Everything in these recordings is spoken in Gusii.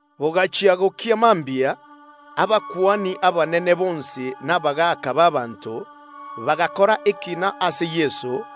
Bogachia gokia mambia, abakuani abanene bonsi na abatureti bagakora omoroberio bw’ogoita Yeso.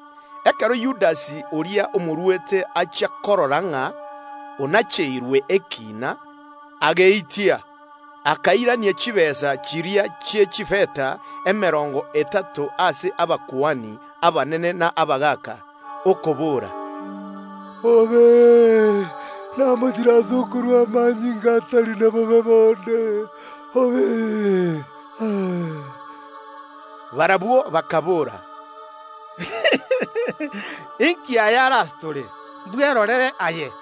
Ekero Yudasi, oria omoruete achia korora ng’a onacheirwe ekiina, ageitia, akairania chitaabu chiria chi’echifeta emerongo etato ase abakuani abanene na abagaaka, okobora, “Namochire ase okorua omonto otari na bobe bonde aitwe.” Barabwo bakaboora, “Ninki aya are ase tore? Echio n’echigurube chiao!”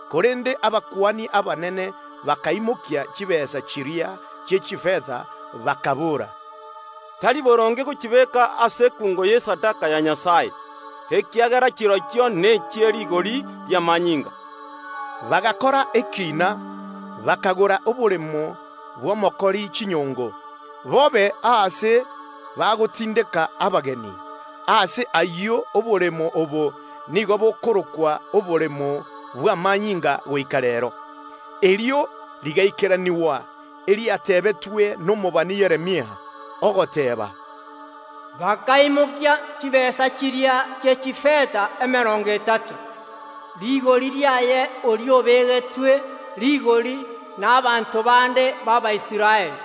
Korende abakuani abanene bakaimokia chitaabu chiria chi’echifeta bakaboora, “Tari boronge gochibeeka ase ekungo y’esadaka ya Nyasae, ekiagera chirochio nechie rigori ri’amanyinga.” Bakanacha ekiina giokogora omogondo bw’omokori chinyongo, obe aase bagotindeka abageni. Ase ayio omogondo oyo nigo okorokwa Omogondo bw’Amanyinga goika reero. Erio rigaikeranigwa eriatebetwe nomobani Yeremia, ogoteeba, “Bakaimokia chitaabu chiria chi’echifeta emerongo etato, rigori riaye oria obegetwe rigori n’abanto bande b’Abaisraeli,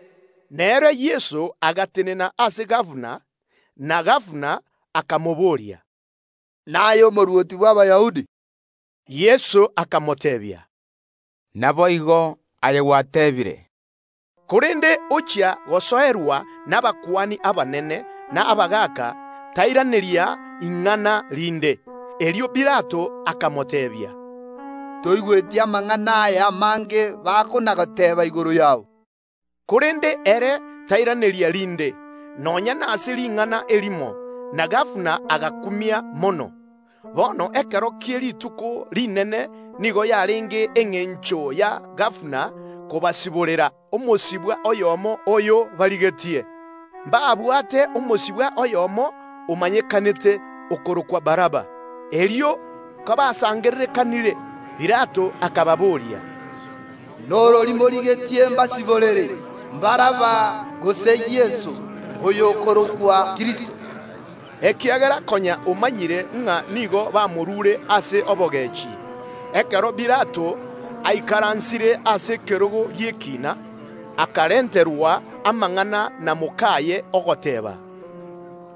Nere Yeso agatenena ase gabana bw’Abarumi; oyio omobooretie, “Naye Omorwoti bw’Abayahudi?” Yeso akamoteebia, “Naboigo, aye gwateebire.” Korende ekero Abakuani abanene na abagaaka bamosoerete, tairaneria ing’ana rinde. Erio Pilato akamoteebia, “Toigweti amang’ana aya amange bakona‐goteeba igoro yao?” Korende ere tairaneria rinde, nonya nase ring’ana erimo, na gabana agakumia mono. Bono ekero kie rituko rinene nigo yarenge engencho ya gabana gosiborera Abayahudi omosibwa oyomo oyo barigetie. Mbabwate omosibwa oyomo omanyekanete, okorokwa Baraba. Erio kobasangererekanire, Pilato akababoria, “Norori morigetie mbasiborere ase abasibwa aba babere Baraba gose Yeso, oyo okorokwa Kristo?” Ekiagera konya omanyire ng’a Abayahudi nigo baruete Yeso ase obogechi. Ekero Pilato aikaransire ase ekerogo gi’ekiina, akarenterwa amang’ana na mok’aye, ogoteeba,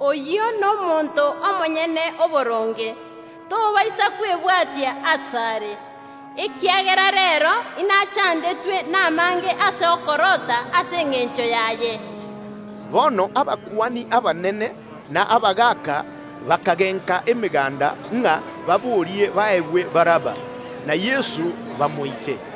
“Oyio nomonto omonyene oboronge, tobaisa kwebwatia asare, ekiagera reero inachandetwe namange ase okorota ase engencho yaye.” Bono abakuani abanene na abagaaka bakagenka emeganda ng’a baborie baegwe Baraba, na Yeso bamoite.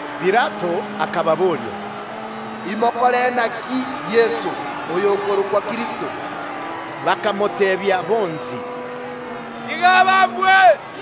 Pilato akababoria, “Imokore naki Yeso, oyo okorokwa Kristo?” Bakamoteebia bonsi, “Tiga abambwe!”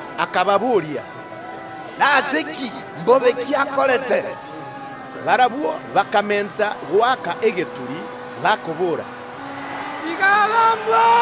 Akababoria, “Nase ki? Mbobe ki akorete?” Barabwo bakamenta goaka egeturi, bakobora, “Tiga abambwe!”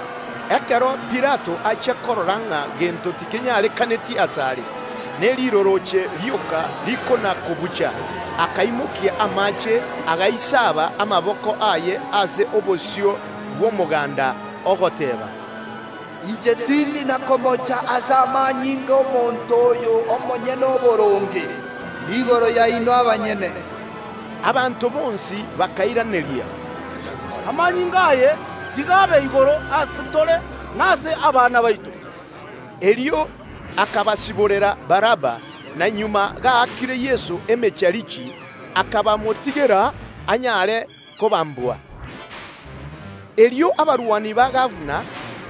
Ekero Pilato achia korora ng’a gento tikenyarekaneti asare, ne rirorooche rioka rikona‐kobucha, akaimokia amaache, agaisaba amaboko aye ase obosio bw’omoganda, ogoteeba, “Inche tindi na komocha ase amanyinga y’omonto oyo omonyene oboronge. Niigoro yaino abanyene.” Abanto bonsi bakairaneria, “Amanyinga aye, tiga abe igoro ase tore, na ase abana baito!” Erio akabasiborera Baraba, na magega gaakire Yeso emecharichi, akabamotigera anyare kobambwa. Erio abarwani ba Pilato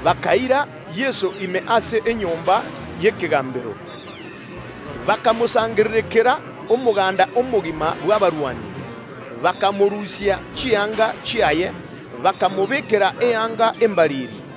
bakaira Yeso ime ase enyomba y’egabana, bakamosangererekanera omoganda omogima bw’abarwani. Bakamorusia chianga chiaye, bakamobeekera eyanga embariri.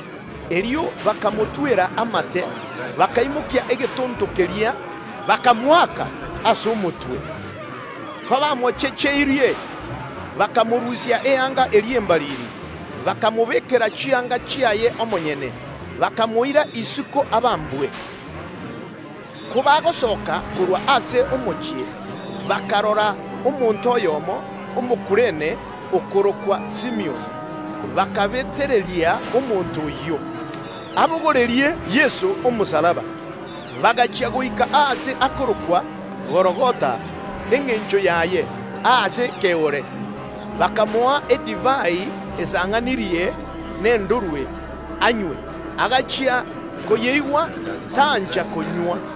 Erio bakamotwera amate, bakaimokia egetonto keria, bakamoaka ase omotwe. Kobamochecheirie, bakamorusia eyanga eria embariri, bakamobeekera chianga chiaye omonyene, bakamoira isiko abambwe. Kobagosoka korwa ase omochie, bakarora omonto oyomo, Omokurene, okorokwa Simioni; erio abasikari bakabetereria omonto oyio abogorerie Yeso omosalaba. Bagachia goika aase akorokwa Gologotha (engencho yaye: Aase Ekeore), bakamoa edivai esang’anirie egento ekeroro, anywe; Agachia koyeigwa, tancha konywa.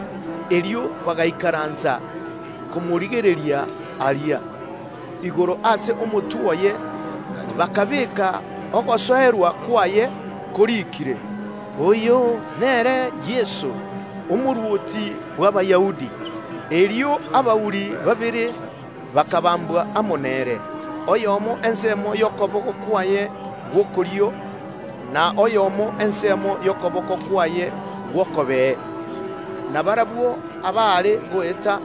Erio bagaikaransa komorigereria aria. Igoro ase omotwe oye bakabeeka ogosoerwa kwaye, koriikire, “OYO NERE YESO, OMORWOTI BW’ABAYAHUDI”. Erio abauri babere bakabambwa amo nere, oyomo ensemo y’okoboko kwaye gw’okorio, na oyomo ensemo y’okoboko kwaye gw’okobee. Na barabwo abaare goeta,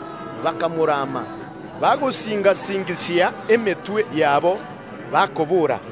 bakamorama, bagosinga‐singisia emetwe yabo, bakobora,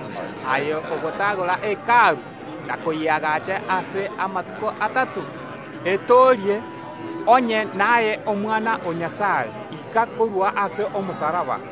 “Aye oyogotagora Hekalu na koyeagaacha ase amatuko atato, etoorie! Onye naye Omwana o Nyasae, ika korwa ase omosalaba.”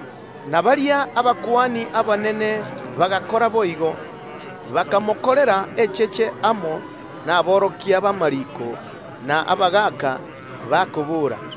Na baria abakuani abanene bagakora boigo, bakamokorera echeche amo naborokia b’amariiko na abagaaka, bakobora,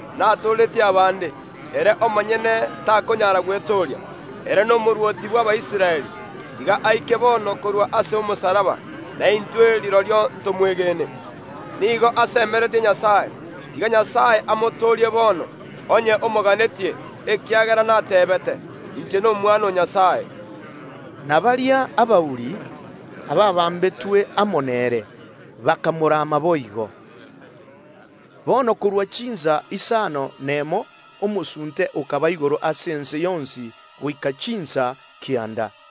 “Natooretie abande, ere omonyene takonyara gwetooria. Ere n’Omorwoti bw’Abaisraeli, tiga aike bono korwa ase omosalaba, na intwe rirorio ntomwegene. Nigo asemeretie Nyasae, tiga Nyasae amotoorie bono, onye omoganetie, ekiagera nateebete: Inche n’Omwana o Nyasae.” Na baria abauri, abaabambetwe amo nere, bakamorama boigo. Bono korwa chinsa isano nemo omosunte okaba igoro ase ense yonsi goika chinsa kianda.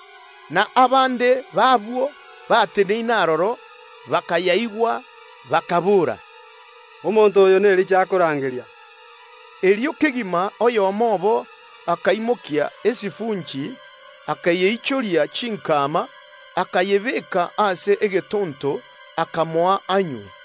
Na abande b’abwo bateneine aroro, bakayaigwa, bakaboora, “Omonto oyo n’Elija akorangeria.” Erio kegima oyomo obo akaimokia esifunchi, akayeichoria chinkama, akayebeeka ase egetonto, akamoa anywe.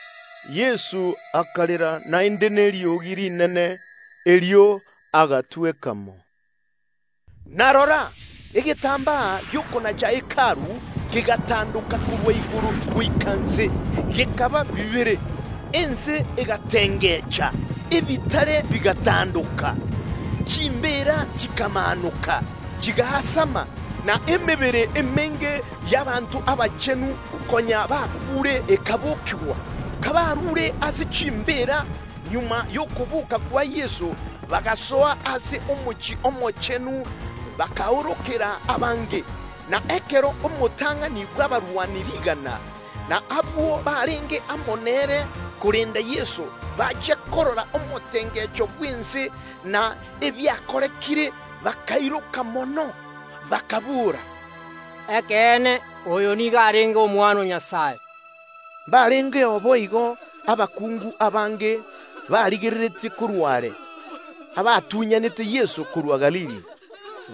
Yeso akarera naende neriogi rinene, erio agatweka mo. Na rora, egetambaa gi’okonacha Hekalu kegatandoka korwa igoro goika inse, gekaba bibere, ense egatengecha, ebitare bigatandoka. Chimbeera chikamaanoka chigaasama, na abanto abange abachenu konya bakuure bakabokigwa. Kabaruure ase chimbeera, magega y’okoboka kwa Yeso bagasoa ase omochie omochenu agwo ase abanto abange babaroche. Na ekero omotang’ani bw’abarwani rigana, na abwo barenge amo nere korenda Yeso, bachia korora omotengecho bw’ense na ebiakorekire, bakairoka mono, bakaboora, “Ekeene, oyo nigo arenge Omwana o Nyasae!” Mbarengeo boigo abakungu abange, barigereretie korwa are, abatunyanete Yeso korwa Galili,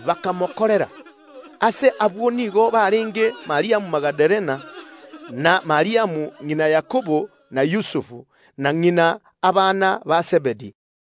bakomokorera. Ase abwo nigo barenge Mariamu Magadalena, na Mariamu ng’ina Yakobo na Yusufu, na ng’ina ’abana ba Zebedi.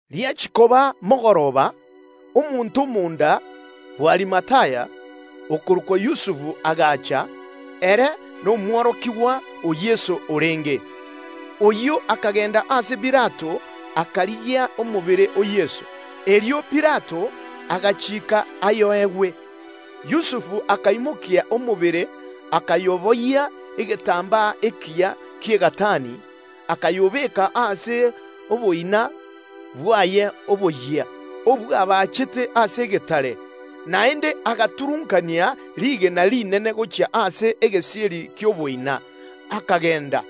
Riachia koba mogoroba, omonto omonda bw’Arimathaya, okorokwa Yusufu, agacha; ere nomworokigwa o Yeso orenge. Oyio akagenda ase Pilato, akarigia omobere o Yeso. Erio Pilato agachiika ayoegwe. Yusufu akaimokia omobere, akayoboyia egetambaa ekiya ki’egatani, akayobeka ase oboina bwaye oboyia, obwabachete ase egetare; naende agaturunkania rigena rinene gochia ase egesieri ki’oboina, akagenda.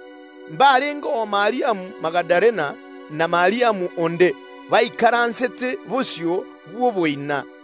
Mbarengeo Mariamu Magadalena na Mariamu onde, baikaransete bosio bw’oboina.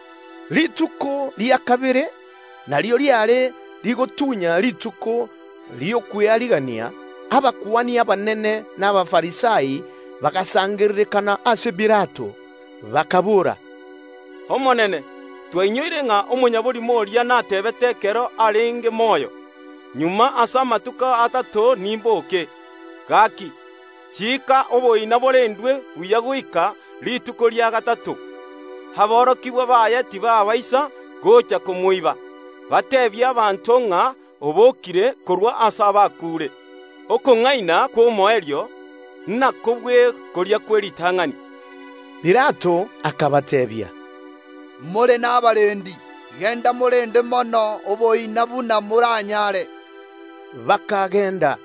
Rituko ria kabere, erio riare rituko ri’Esabato, abakuani abanene na Abafarisai bagasangererekana ase Pilato, bakaboora, “Omonene, twainyoire ng’a omong’ainereria oria nateebete ekero arenge moyo: Magega ase amatuko atato nimboke. Gaki, chiika oboina borendwe buya goika rituko ria gatato, aborokigwa baye tibaabaisa gocha komoiba, bateebie abanto ng’a obokire korwa ase abakuure; oborimo bw’omoerio inabobue boria bw’eritang’ani.” Pilato akabateebia, “More nabarendi; genda morende mono oboina buna moranyaare.” Ase igo bakagenda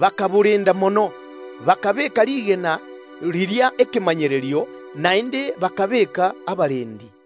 bakarenda oboina mono ase okobeeka rigena riria ekemanyererio, naende bakabeeka abarendi.